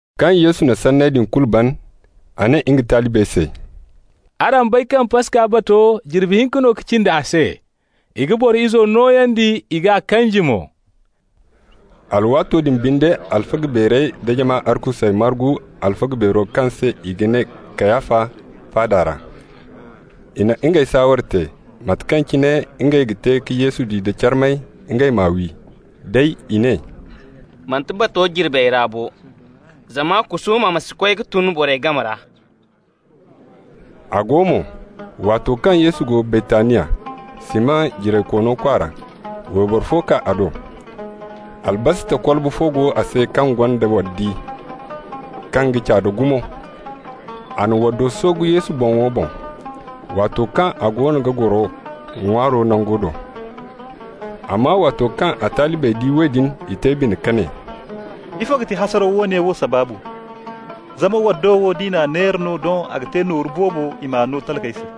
Kaŋ Yesu na sanney din kulu ban, a ne nga talibey se: «Araŋ bay kaŋ Paska bato jirbi hinka no ka cindi a se. I ga Boro Izo nooyandi, i g'a kanji mo.» Alwaato din binde alfaga beerey da jama arkusey margu alfaga beero kaŋ se i ga ne Kayafa faada ra. I na ngey saaware te, mate kaŋ cine ngey ga te ka Yesu di da carmay, ngey m'a wi. Day i ne: «Manti bato jirbey ra bo, zama kusuuma ma si koy ka tun borey game ra.» A go mo, waato kaŋ Yesu go Baytaniya, Siman jiraykoono kwaara, wayboro fo kaa a do. Albasta kolbo fo go a se kaŋ gonda waddi kaŋ ga caada gumo. A na waddo soogu Yesu boŋo boŋ, waato kaŋ a goono ga goro ŋwaayaŋ nango do. Amma waato kaŋ a talibey di woodin, i te bine ka ne: «Ifo ga ti hasaraw woone wo sabaabu? Zama waddo wo, d'i n'a neera no, doŋ a ga te nooru boobo, i m'a no talkey se.»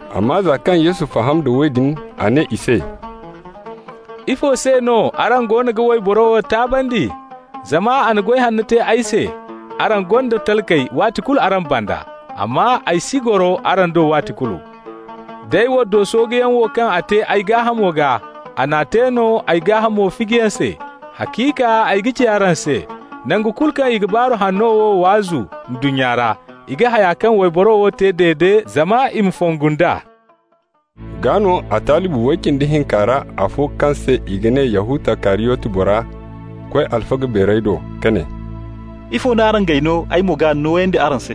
Amma za kaŋ Yesu faham da woodin, a ne i se: «Ifo se no araŋ goono ga wayboro wo taabandi? Zama a na goy hanno te ay se. Araŋ gonda talkey waati kulu araŋ banda, amma ay si goro araŋ do waati kulu. Day waddo sooguyaŋo wo kaŋ a te ay gaahamo gaa, a n'a te no ay gaahamo fijiyaŋ se. Haciika ay ga ci araŋ se: nangu kulu kaŋ i ga Baaru Hanno wo waazu ndunnya ra, i ga haya kaŋ waybora wo te dede zama i ma fongu nd'a.» Gaa no a talibi way cindi hinka ra, afo kaŋ se i ga ne Yahuta Kariyoti bora koy alfaga beerey do ka ne: «Ifo no araŋ g'ay no, ay mo g'a nooyandi araŋ se?»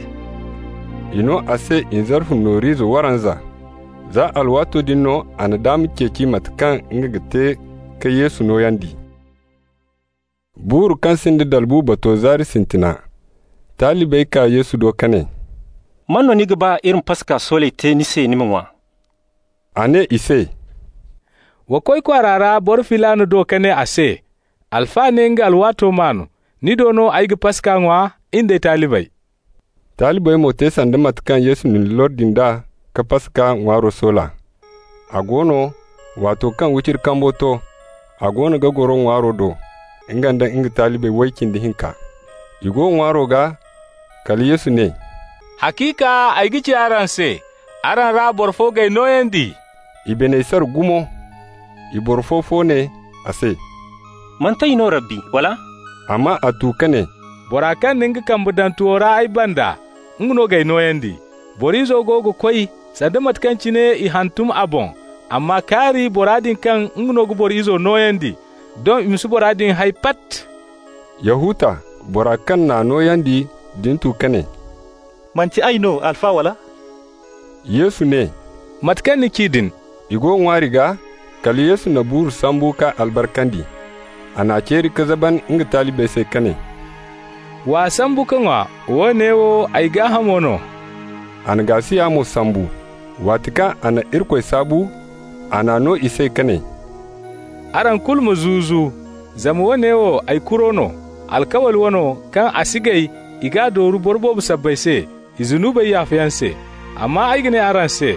I no a se nzarfu noor'ize waranza. Za alwaato din no a na daama ceeci mate kaŋ nga ga te ka Yesu nooyandi. Buuru kaŋ sinda dalbu bato zaari sintina, talibey kaa Yesu do ka ne: «Man no ni ga ba iri ma Paska sooley te ni se ni ma ŋwa?» A ne i se: «Wa koy kwaara ra boro filaana do ka ne a se: ‹Alfa ne nga alwaato maan. Ni do no ay ga Paska ŋwa, in d'ay talibey.›» Talibey mo te sanda mate kaŋ Yesu n'i lordi nd'a ka Paska ŋwaaro soola. A go no, waato kaŋ wiciri kambo to, a goono ga goro ŋwaaro do, nga nda nga talibi way cindi hinka. I go ŋwaayaŋo gaa, kala Yesu ne: «Haciika ay ga ci araŋ se: araŋ ra boro fo g'ay nooyandi.» I biney sara gumo. I boro fo-fo ne a se: «Manti ay no, Rabbi, wala?» Amma a tu ka ne: «Bora kaŋ na nga kambe daŋ tuwo ra ay banda, nga no g'ay nooyandi. Boro Izo go ga koy, sanda mate kaŋ cine i hantum a boŋ, amma kaari bora din kaŋ nga no ga Boro Izo nooyandi! Doŋ i ma si bora din hay, pat!» Yahuta, bora kaŋ n'a nooyandi din tu ka ne: «Manti ay no, Alfa, wala?» Yesu ne: «Mate kaŋ ni ci din.» I go ŋwaari gaa, kala Yesu na buuru sambu k'a albarkandi. A n'a ceeri ka zaban nga talibey se ka ne: «W'a sambu ka ŋwa, woone wo ay gaahamo no.» A na gaasiya mo sambu. Waati kaŋ a na Irikoy saabu, a n'a no i se ka ne: «Araŋ kulu ma zu-zu. Zama woone wo ay kuro no, alkawli wano, kaŋ a si gay i g'a dooru boro boobo sabbay se, i zunubey yaafayaŋ se. Amma ay ga ne araŋ se: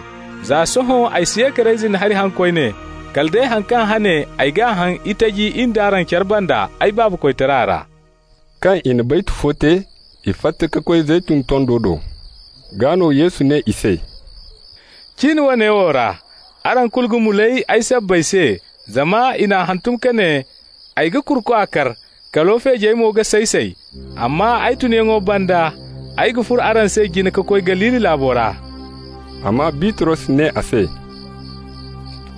Za sohõ ay si ye ka reyzin hari haŋ koyne, kala day han kaŋ hane ay g'a haŋ itaji in d'araŋ care banda, ay Baabo koytara ra.» Kaŋ i na baytu fo te, i fatta ka koy Zeytun tondo do. Gaa no Yesu ne i se: «Cin woone wo ra, araŋ kulu ga mulay ay sabbay se, zama i n'a hantum ka ne: ‹Ay ga kurukwa kar, kalo feejey mo ga say-say.› Amma ay tunyaŋo banda ay ga furo araŋ se jine ka koy Galili laabo ra.» Amma Bitros ne a se: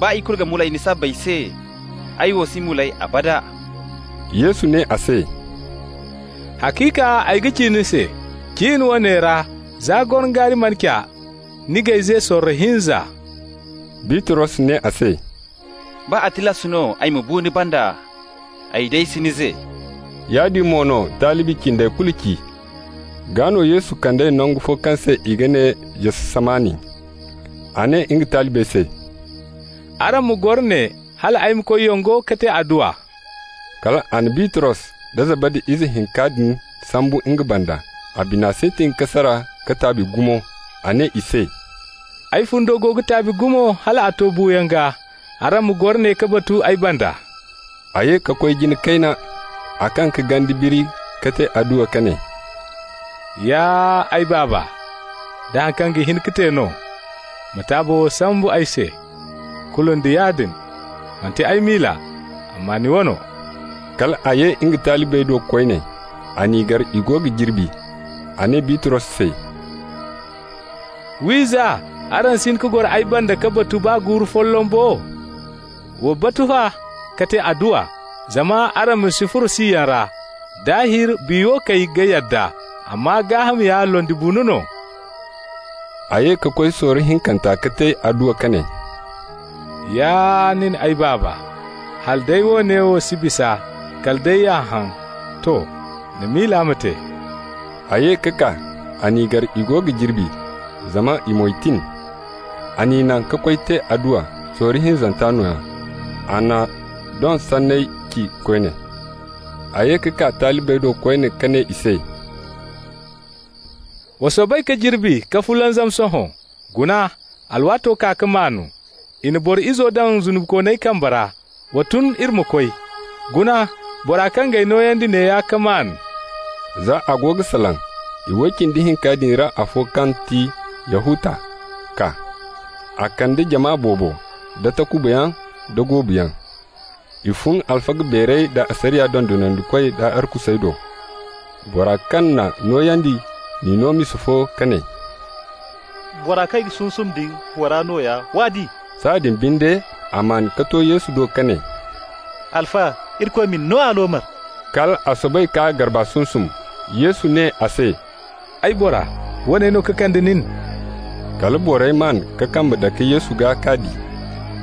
«Baa i kulu ga mulay ni sabbay se, ay wo si mulay, abada.» Yesu ne a se: «Haciika ay ga ci ni se: cin woone ra, za gorongaari mana ca, ni g'ay ze sorro hinza.» Bitros ne a se: «Baa a tilas no ay ma bu ni banda, ay day si ni ze.» Yaadin mo no talibi cindey kulu ci. Gaa no Yesu kand'ey nangu fo kaŋ se i ga ne Jatsamani. A ne nga talibey se: «Araŋ ma goro ne hal ay ma koy yongo ka te adduwa.» Kal a na Bitros da Zabadi ize hinka din sambu nga banda. A bina sintin ka sara ka taabi gumo. A ne i se: «Ay fundo go ga taabi gumo hal a to buuyaŋ gaa. Araŋ ma goro ne ka batu ay banda.» A ye ka koy jina kayna, a kaŋ ka ganda biri ka te adduwa ka ne: «Ya ay Baaba! Da haŋ kaŋ ga hin ka te no, ma taabo wo sambu ay se. Kulu nda yaadin, manti ay miila, amma ni wano.» Kal a ye nga talibey do koyne. A n'i gar i go ga jirbi. A ne Bitros se: «Wiiza! araŋ si hin ka goro ay banda ka batu baa guuru folloŋ bo? Wa batu fa, ka te adduwa, zama araŋ ma si furo siyaŋ ra. Daahir biya wo kay ga yadda, amma gaaham ya londibuuno no.» A ye ka koy sorro hinkanta ka te adduwa ka ne: «Ya nin ay Baaba, hala day woone wo si bisa kala day y'a haŋ, to, ni miila ma te.» A ye ka kaa, a n'i gar i go ga jirbi, zama i moy tin. A n'i naŋ ka koy te adduwa, sorro hinzanta nooya. A na doŋ sanney ci koyne. A ye ka kaa talibey do koyne ka ne i se: «Wa soobay ka jirbi ka fulanzam sohõ. Guna, alwaato kaa ka maan. I na Boro Izo daŋ zunubikooney kambey ra. Wa tun, iri ma koy. Guna, bora kaŋ g'ay nooyandi neeya ka maan!» Za a go ga salaŋ, iway cindi hinka din ra afo kaŋ ti Yahuta kaa. A kande jama boobo da takubayaŋ da goobuyaŋ. I fun alfaga beerey da asariya dondonandikoy da arkusey do. Bora kaŋ n'a nooyandi n'i no misa fo ka ne: «Bora kaŋ ay g'a sunsum din, bora nooya. W'a di.» Sahãadin binde a maan ka to Yesu do ka ne: «Alfa, Irikoy ma ni no aloomar!» Kal a soobay k'a garba sunsum. Yesu ne a se: «Ay bora, woone no ka kande nin?» Kala borey maan ka kambe dake Yesu gaa k'a di.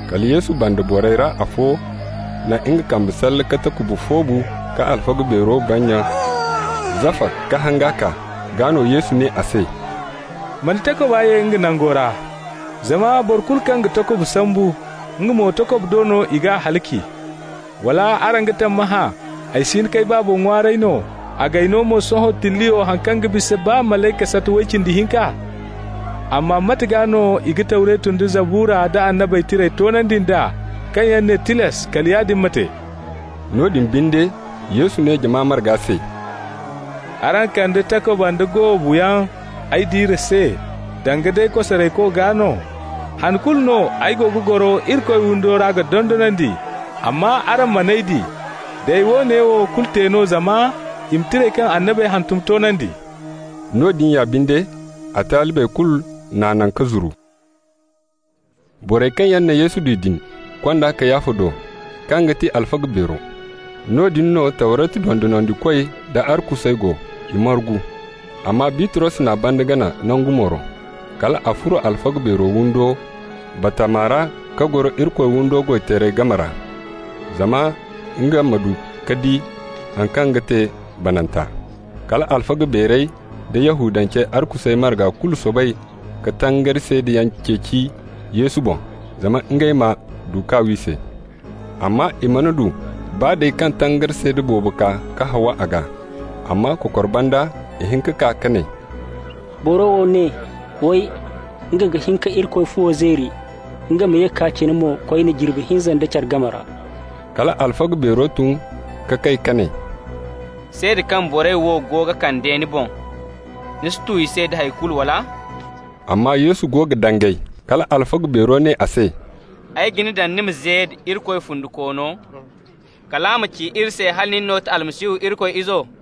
Kala Yesu banda borey ra afo na nga kambe salle ka takuba foobu ka alfaga beero bannya zafa k'a hanga kaa. Gaa no Yesu ne a se: «Ma ni takuba ye nga nango ra, zama boro kulu kaŋ ga takuba sambu, nga mo takuba do no i g'a halaci. Wala araŋ ga tammahã ay si hin k'ay Baabo ŋwaaray no, a g'ay no mo sohõ tilliyo haŋ kaŋ ga bisa baa malayka sata way cindi hinka? Amma mate gaa no i ga Tawretu nda Zabura nda Annabey Tirey toonandi nd'a kaŋ yaŋ ne tilas kala yaadin ma te?» Noodin binde, Yesu ne jama marga se: «Araŋ kande takuba nda goobu yaŋ ay diire se danga day kosarayko gaa no? Han kulu no ay go ga goro Irikoy windo ra ga dondonandi, amma araŋ man'ay di. Day, woone wo kulu te no zama i ma Tirey kaŋ annabey hantum toonandi.» Noodin ya binde a talibey kulu n'a naŋ ka zuru. Borey kaŋ yaŋ na Yesu di din kond'a Kayafa do, kaŋ ga ti alfaga beero. Noodin no Tawretu dondonandikoy nda arkusey go, i margu. Amma Bitros n'a banda gana nangu mooro. Kal a furo alfaga beero windo batama ra ka goro Irikoy windo goy-teerey game ra, zama nga ma du ka di haŋ kaŋ ga te bananta. Kal alfaga beerey da Yahudancey arkusey marga kulu soobay ka tangari seedayaŋ ceeci Yesu boŋ zama ngey ma du k'a wi se. Amma i mana du, baa day kaŋ tangari seeda boobo kaa ka haawa a gaa. Amma kokor banda ihinka kaa ka ne: «Boro wo ne, way: nga ga hin ka Irikoy fuwo zeeri, nga ma ye k'a cina mo koyne jirbi hinza nda care game ra.» Kala alfaga beero tun ka kay ka ne: «Seeda kaŋ borey wo go ga kande ni boŋ, ni si tu da hay kulu, wala?» Amma Yesu go ga dangay. Kala alfaga beero ne a se: «Ay ga ni daŋ ni ma ze nda Irikoy fundikoono, kala ma ci iri se hala nin no ga ti Almasihu, Irikoy Izo?»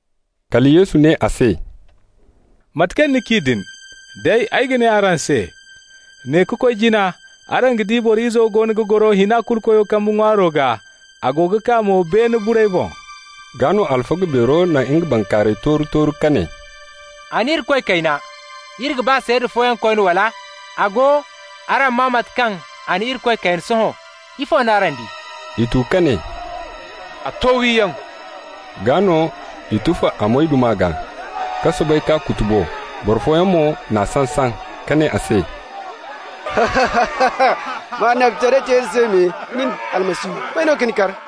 Kala Yesu ne a se: «Mate kaŋ ni ci din. Day, ay ga ne araŋ se: ne ka koy jina araŋ ga di Boro Izo goono ga goro Hina-Kulu-Koyo kambe ŋwaaro gaa, a go ga kaa mo beene burey boŋ.» Gaa no alfaga beero na nga bankaaray tooru-tooru ka ne: «A na Irikoy kayna! Iri ga ba seeda fooyaŋ koyne, wala? A go, araŋ maa mate kaŋ a na Irikoy kayna sohõ. Ifo no araŋ di?» I tu ka ne: «A to wiyaŋ.» Gaa no i tufa a moyduma gaa, ka soobay k'a kutubo. Boro fooyaŋ mo n'a saŋ-saŋ ka ne a se: «Ma annabitaray te iri se me, nin, Almasihu! May no ka ni kar?»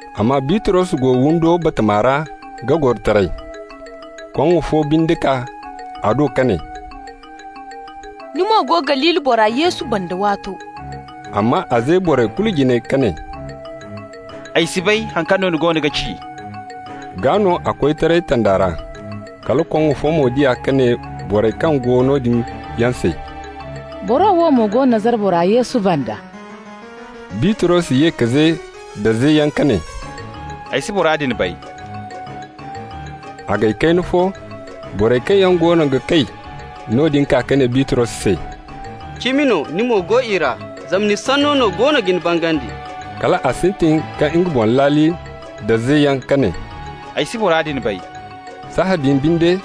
Amma Bitros go windo batama ra ga goro taray. Koŋŋo fo binde kaa a do ka ne: «Ni mo go Galili bora Yesu banda waato.» Amma a ze borey kulu jine ka ne: «Ay si bay haŋ kaŋ no ni goono ga ci.» Gaa no a koy taray tanda ra. Kala koŋŋo fo mo di a ka ne borey kaŋ go noodin yaŋ se: «Boro wo mo go Nazara bora Yesu banda.» Bitros ye ka ze da zeyaŋ ka ne: «Ay si bora din bay.» A gay kayna fo, borey kaŋ yaŋ goono ga kay noodin kaa ka ne Bitros se: «Cimi no ni mo go i ra, zama ni sanno no goono ga ni bangandi.» Kal a sintin ka nga boŋ laali nda zeyaŋ ka ne: «Ay si bora din bay!» Sahãadin binde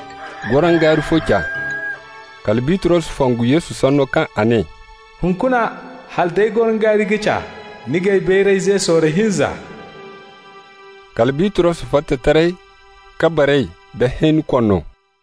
gorongaari fo ca. Kala Bitros fongu Yesu sanno kaŋ a ne: «Hunkuna hala day gorongaari ga ca, ni g'ay bayray ze sorro hinza.» Kala Bitros fatta taray ka baray da hẽeni koono.